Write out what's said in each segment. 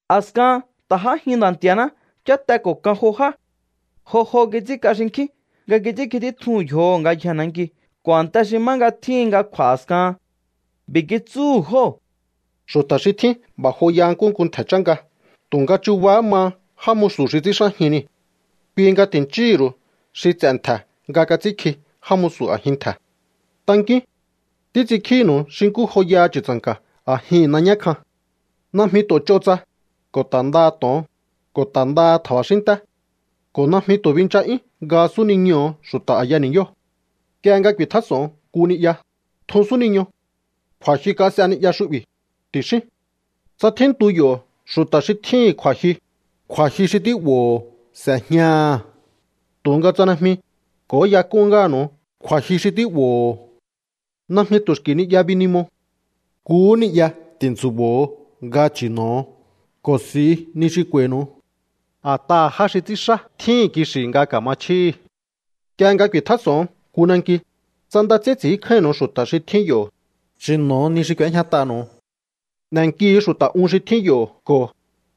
A̱skahan ta̱ j'ájin Nda̱ Nti̱a̱ná cháte ko̱ kan jo já. Jo jo kits'ínk'a xinkjín nga kits'ínkji títjuhu̱n yjoho̱ ngayjee̱ nanki ko̱ a̱nte xi má nga tjíhin nga kj'u̱a̱ a̱skahan. B'i̱ kitsúhu̱ jóo̱: —Xu̱ta̱ xi tjín b'a̱ joyaha nkúhu nku ntje̱ chánka, tu̱nga chubahá maha já musu̱ xi ts'i̱ínxájin nii̱. Kui nga ti̱nchíhi̱ ru̱u xi ts'e̱ ntje̱ nga kats'ínkji já musu̱ a̱jin ntje̱. Tankíún. Títs'inkjínu̱u xi nkú joyaha chu̱tsa̱nka̱ a̱jihi̱n nañá kjan. Najmi tu̱ ch'o tsa, ko̱ ta̱ ndaha to̱on, ko̱ ta̱ ndaha tja̱ba̱xínnté. Ko̱ najmi tu̱ bincha'yún nga súniñoho̱ xu̱ta̱ a̱ya ni̱yóo̱. ’Nk'ie nga ku̱i̱tjás'o̱on nku ni'ya, tjun súniño. “Kju̱a̱jyu kas'e ni'ya xu'bi̱”, ti̱xíún. Tsa tjíntu yo̱ xu̱ta̱ xi tjíhi̱n kju̱a̱jyu, kju̱a̱jyu xi tí'bo̱o s'e̱jñaha̱. Tu̱nga tsa najmi, k'o̱óyak'un ngáha̱nu̱u kju̱a̱jyu xi tí'bo̱o. Najmi tu̱ xki̱ ni'ya binimo. Nkuhú ni'ya ti̱ntsu̱bo̱o nga chi̱no̱o ko̱ s'i̱u ni xi k'u̱a̱i̱nu̱u. A̱t'aha̱ já xi ts'ínxá tjíhi̱n kixi̱ nga ka̱ma chjíhi̱. ’Nk'ie nga ku̱i̱tjás'o̱on nku nanki, tsa nda ts'ín ts'i̱ínkjáínnu̱u xu̱ta̱ xi tjín yo̱, chi̱no̱o ni xi k'u̱éjñat'anu̱u. N'e̱nkihu̱u xu̱ta̱ un xi tjín yo̱ ko̱: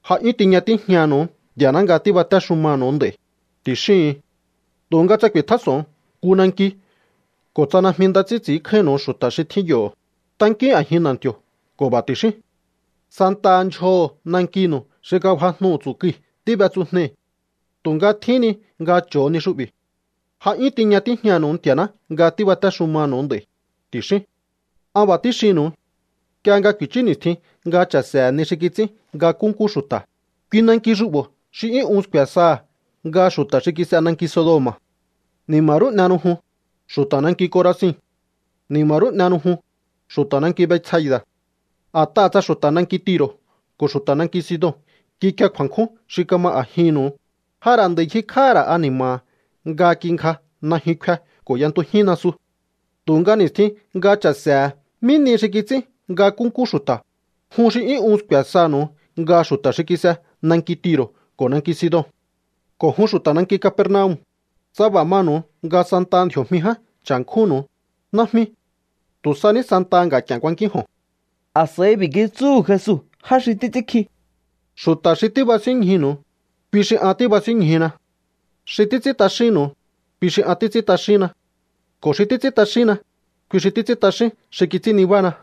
“Ja 'yún tiña tíjñanu̱u Nti̱a̱ná nga tíbatéxumanu̱u nd'a̱i̱”, ti̱xíhu̱un. Tu̱nga tsa ku̱i̱tjás'o̱on nku nanki ko̱ tsa najmi nda ts'ín ts'i̱ínkjáínnu̱u xu̱ta̱ xi tjín yo̱, tankíún a̱jin na̱nti̱o̱ ko̱ b'a̱ ti̱xíún: “Santaha ndyjoho̱ nankinu̱u xi kafajnu tsu̱kui̱ tíb'etsujnei̱. Tu̱nga tjíhín ni nga cho̱o ni xu'bi̱. Ja 'yún tiña tíjñanu̱u Nti̱a̱ná nga tíbatéxumanu̱u nd'a̱i̱”, ti̱xíún. An b'a̱ tíxinnu̱u. Nk'ie nga ku̱i̱chú ni̱stjin nga cha̱se̱he̱ ni xi kits'ín nga nkúnkú xu̱ta̱, kui nanki xu'bo̱ xi 'yún un sku̱e̱ saha̱ nga xu̱ta̱ xi kis'e nanki Sodoma̱. ’¡Ni̱ma̱ rú n'ehenu jun, xu̱ta̱ nanki Corazin! ¡Ni̱ma̱ rú n'ehenu jun, xu̱ta̱ nanki Betsaida̱! A̱t'aha̱ tsa xu̱ta̱ nanki Tiro̱ ko̱ xu̱ta̱ nanki Sidon kikie kju̱a̱nkjún xi kama a̱jinnu̱u, ja ra̱ nd'a̱i ngjikj'áha̱ ra̱ ani̱ma̱ha̱ nga kingja najyun kfe ko̱ y'entujín nasu. Tu̱nga ni̱stjin nga cha̱se̱he̱ mí nihi xi kits'ín nga nkúnkú xu̱ta̱, jun xi 'yún un sku̱e̱ sanu̱u nga xu̱ta̱ xi kis'e nanki Tiro̱ ko̱ nanki Sidon. ’Ko̱ jun xu̱ta̱ nanki Capernaum, tsa b'a̱ manu̱u nga santaha ndji̱o̱jmi ján cha̱nkjúnnu̱u, najmi. Tu̱ sa ní santaha nga̱k'i̱e̱n kuankínjo̱on. A̱s'a̱i b'i̱ kitsúhu̱ Jesu já xi títs'ínkji: —Xu̱ta̱ xi tíbasínñjunu̱u, kui xi an tíbasínñjuna. Xi títs'ín t'axínnu̱u, kui xi an títs'ín t'axínna. Ko̱ xi títs'ín t'axínna, kui xi títs'ín t'axín xi kits'ín nibána.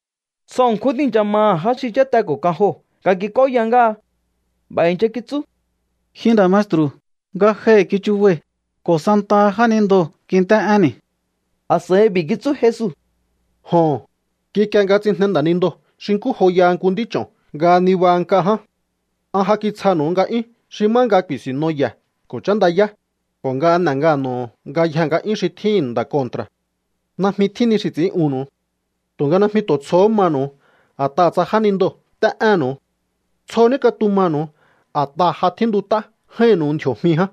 Tsjo ṉkjún tíi̱ncha maha̱ já xi cháte ko̱ kan joo̱ nga kik'óya ngáha. B'a̱ i̱ncha kitsú: —Ji nda̱ maestru̱, ngajohi̱ kichubai̱ ko̱ santaha jánindoo̱ kint'é'énni̱. A̱s'a̱i b'i̱ kitsú Jesu: —Joho̱n, kikie nga tsijne nda̱nindoo̱ xi nkú joyaha nku nd'ích'o̱n nga nibaha nk'a ján. An ja kitsjanu̱u nga'yún xi má nga ku̱i̱sinno ye̱ ko̱ chándayá, ko̱ nga n'e̱ ngano̱ho̱ ngayje nga'yún xi tjíhi̱n nda̱ kontra̱. Najmi tjín ni xi ts'i̱ín'unnu̱u. Tu̱nga najmi tu̱ tsjohó manu̱u a̱t'aha̱ tsa jánindoo̱ nt'é'énnu̱u. Tsjo ní katumanu̱u a̱t'aha̱ ja tjíntut'á j'áínnu̱u ndji̱o̱jmi ján.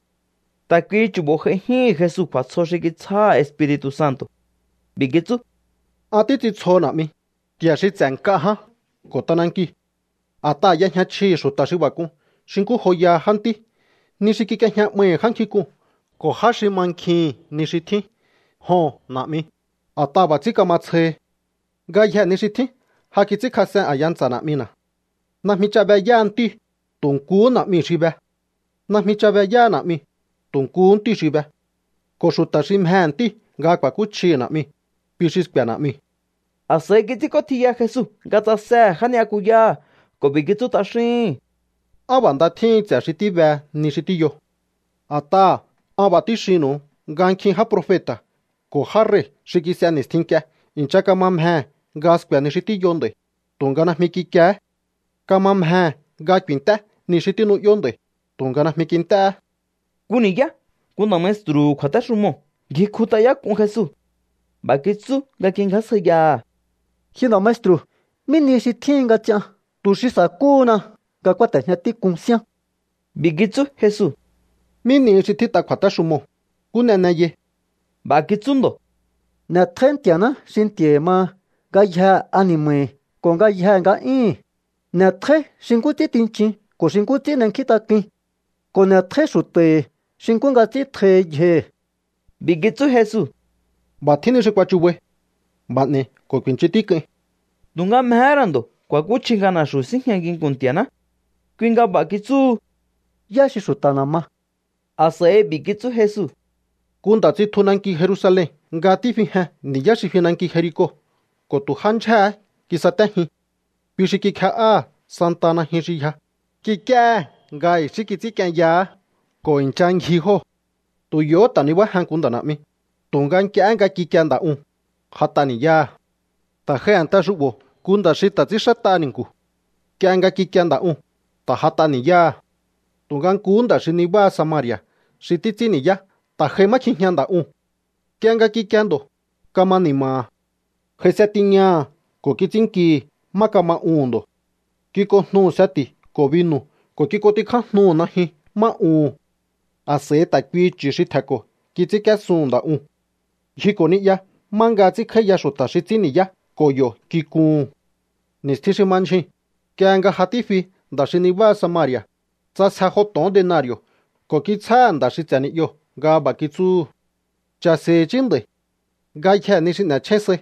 Ta̱ kuihi chu̱bo̱ j'aijíhi̱n Jesu kju̱a̱tsjo xi kitsjáha̱ Espiri̱tu̱ Santo̱. B'i̱ kitsú: —An títs'intsjoho, Na̱'mi, Nti̱a̱ xi ts'e̱ nk'a ján ko̱ t'anankiu̱. A̱t'aha̱ y'ejña chjihi̱ xu̱ta̱ xi b'a̱ k'un xi nkú joyaha jántí ni xi kik'iejña 'maihi̱ já nkjink'uu̱n ko̱ já xi mankjihi̱n ni xi tjín. Joho̱n, Na̱'mi, a̱t'aha̱ b'a̱ ts'ín kama tsjohi. ’Ngayjee̱ ni xi tjín ja kits'ínkjas'en a̱ya ntsa̱ Na̱'mina̱. Najmi ch'a be yáha ntíu̱, tu̱ nkuhú Na̱'miu̱ xi be. Najmi ch'a be yáha Na̱'miu̱, tu̱ nkuhú Ntíu̱ xi be. Ko̱ xu̱ta̱ xi mjehe̱ Ntíu̱ nga ku̱a̱kúchjihi̱ Na̱'miu̱, kui xi sku̱e̱ Na̱'miu̱. A̱s'a̱i kits'ínk'ótjiya Jesu nga tsasehe̱ já ni'yakuyáha̱ ko̱ b'i̱ kitsú t'axíhi̱n: —Á b'a̱ nda tjíhin ts'e̱ xi tíbe ni xi tíyo. A̱t'aha̱ an b'a̱ tíxinnu̱u nga nkjin já profeta̱ ko̱ já rei̱ xi kis'e ni̱stjin nk'ie i̱ncha kama mjehe̱ nga sku̱e̱ ni xi tíyo nd'a̱i̱, tu̱nga najmi kikiehé. Kama mjehe̱ nga ku̱i̱nt'é ni xi tínu'yó nd'a̱i̱, tu̱nga najmi kint'éhé. Nku ni̱yá nku nda̱ maestru̱hu̱ kju̱a̱téxumoo̱ ngjikjut'ayák'un Jesu. B'a̱ kitsú nga kingjásjaiyaha̱: —Ji nda̱ maestru̱, ¿mí ni xi tjíhin nga ts'ian tu̱ xi sa̱kúhuna nga kúáte̱jña tík'un síán? B'i̱ kitsú Jesu: —¿Mí nihi xi tjít'a kju̱a̱téxumoo̱? ¿Nkú n'e n'eyai? B'a̱ kitsú ndo̱: —“N'e̱tjóí Nti̱a̱ná xi Nti̱a̱hi̱ maha ngayjee̱ ani̱ma̱hi̱ ko̱ ngayjee̱ nga'yíhi̱n. N'e̱tjóí xi nkú ts'ín tinchin ko̱ xi nkú ts'ín n'enkjíntak'uin. Ko̱ n'e̱tjóí xu̱ta̱hi̱ xi nkú nga ts'ín tjohi yjohi̱.” B'i̱ kitsú Jesu: —B'a̱ tjín ni xi kuachubai. B'a̱ n'e̱i̱ ko̱ ku̱i̱nchun tík'uin. Tu̱nga mjehé ra̱ ndo̱ kju̱a̱kúchji nga na̱xu̱ síjña nginku̱n Nti̱a̱ná. Kui nga b'a̱ kitsúhu: —¿Yá xi xu̱ta̱na̱ ma? A̱s'a̱i b'i̱ kitsú Jesu: —Nku nda̱ tsitju nanki Jerusalen nga tífijen ni̱yá xi fi nanki Jerico ko̱ tu̱ já ndyjéhé kisatéjin. Kui xi kikje'áha̱ santaha najyun xi yja, kik'íéhe̱ nga i̱xí kits'ínk'ienyahá ko̱ i̱ncha ngji jóo̱. Tu̱ yo̱hó ta̱ nibájen nku nda̱ na̱'mi, tu̱nga nk'iehé nga kikie nda̱ uu̱n, j'at'a ni̱yáha̱. Ta̱ j'ai a̱nte xu'bo̱ nku nda̱ xi ta̱ ts'ínxát'a ni̱nku̱. Nk'ie nga kikie nda̱ uu̱n, ta̱ j'at'a ni̱yáha̱. ’Tu̱nga nkuhú nda̱ xi nibá Samari̱a̱ xi títs'ín ni̱yá ta̱ j'ai má kjijña nda̱ uu̱n. Nk'ie nga kikie ndo̱, kama ni̱ma̱ha̱. J'aise tiñaha̱ ko̱ kits'ínnkihi̱ má kama uhu̱n ndo̱. Kik'onjnuhu̱ seti̱ ko̱ binu̱ ko̱ kik'ontikjájnuhu̱ najyun má uhu̱n. A̱s'a̱i ta̱ kuihi chu̱ xi tje̱nko̱ kits'ínk'íésun nda̱ uu̱n. Ngjiko̱ ni'ya má nga ts'ínkj'áíya xu̱ta̱ xi ts'ín ni̱yá ko̱ yo̱ kikuhu̱n. Ni̱stjin xi ma ndyjuu̱n, nk'ie nga ja tífi nda̱ xi nabá Samari̱a̱, ts'asje jo to̱on denari̱o̱ ko̱ kitsjáha̱ nda̱ xi ts'e̱ ni'yoo̱ nga b'a̱ kitsúhu̱: “Cha̱se̱i̱hi̱ i̱chí nda̱i̱. Ngayjee̱ ni xi n'e̱chjén sai,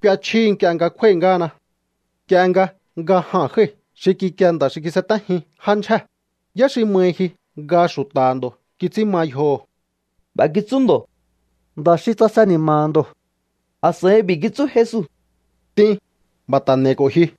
k'uechjíhi nk'ie nga kjúái̱ ngáhana.” ’Nda tjín. Nk'ie nga nga jaa̱n jái̱ xi kikie nda̱ xi kisatéjin já ndyjée̱, ¿yá xi mahi ji nga xu̱ta̱ha̱ ndo̱ kits'ín ma yjoho? B'a̱ kitsú ndo̱: —Nda̱ xi tsase ni̱ma̱ha̱ ndo̱. A̱s'a̱i b'i̱ kitsú Jesu: —T'in, b'a̱ ta̱ n'e̱i̱ ko̱ ji.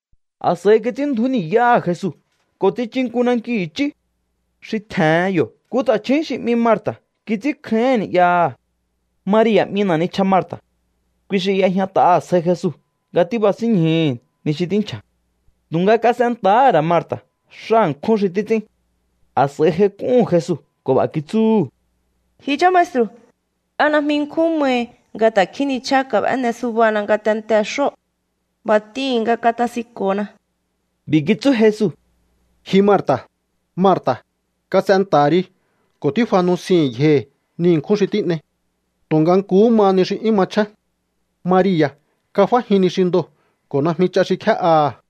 A̱s'a̱i kits'ínndju̱ú ni̱yáha̱ Jesu ko̱ tsichu nku nanki i̱chí. Xi tje̱hen yo̱ nku ta̱chju̱ún xi 'mi Marta̱ kits'ínkjáíhi̱n ni'yaha̱. Maria̱ 'mi na̱ nichja Marta̱. Kui xi y'ejñat'a sjai Jesu nga tíbasínñjuhu̱ ni xi tínchja̱. Tu̱nga kas'enta̱há ra̱ Marta̱ xá ṉkjún xi títs'ín. A̱s'a̱i j'aik'úhu̱n Jesu ko̱ b'a̱ kitsúhu̱: —Ji chá maestru̱, ¿a najmi nkjún mahi nga ta̱kjín nichja kab'éne subana ngatentee̱ xóo̱? B'a̱ t'ihi̱n nga katasinko̱na. B'i̱ kitsú Jesu: —Ji Marta̱, Marta̱, kas'enta̱ha ri ko̱ tífa nusihi̱n yjohi̱ ni ṉkjún xi tín'ei. Tu̱nga nkuhú maha ni xi 'yún machjén. Maria̱ kaf'ájin ni xi ndoo̱ ko̱ najmi ch'a xi kjé'aha̱.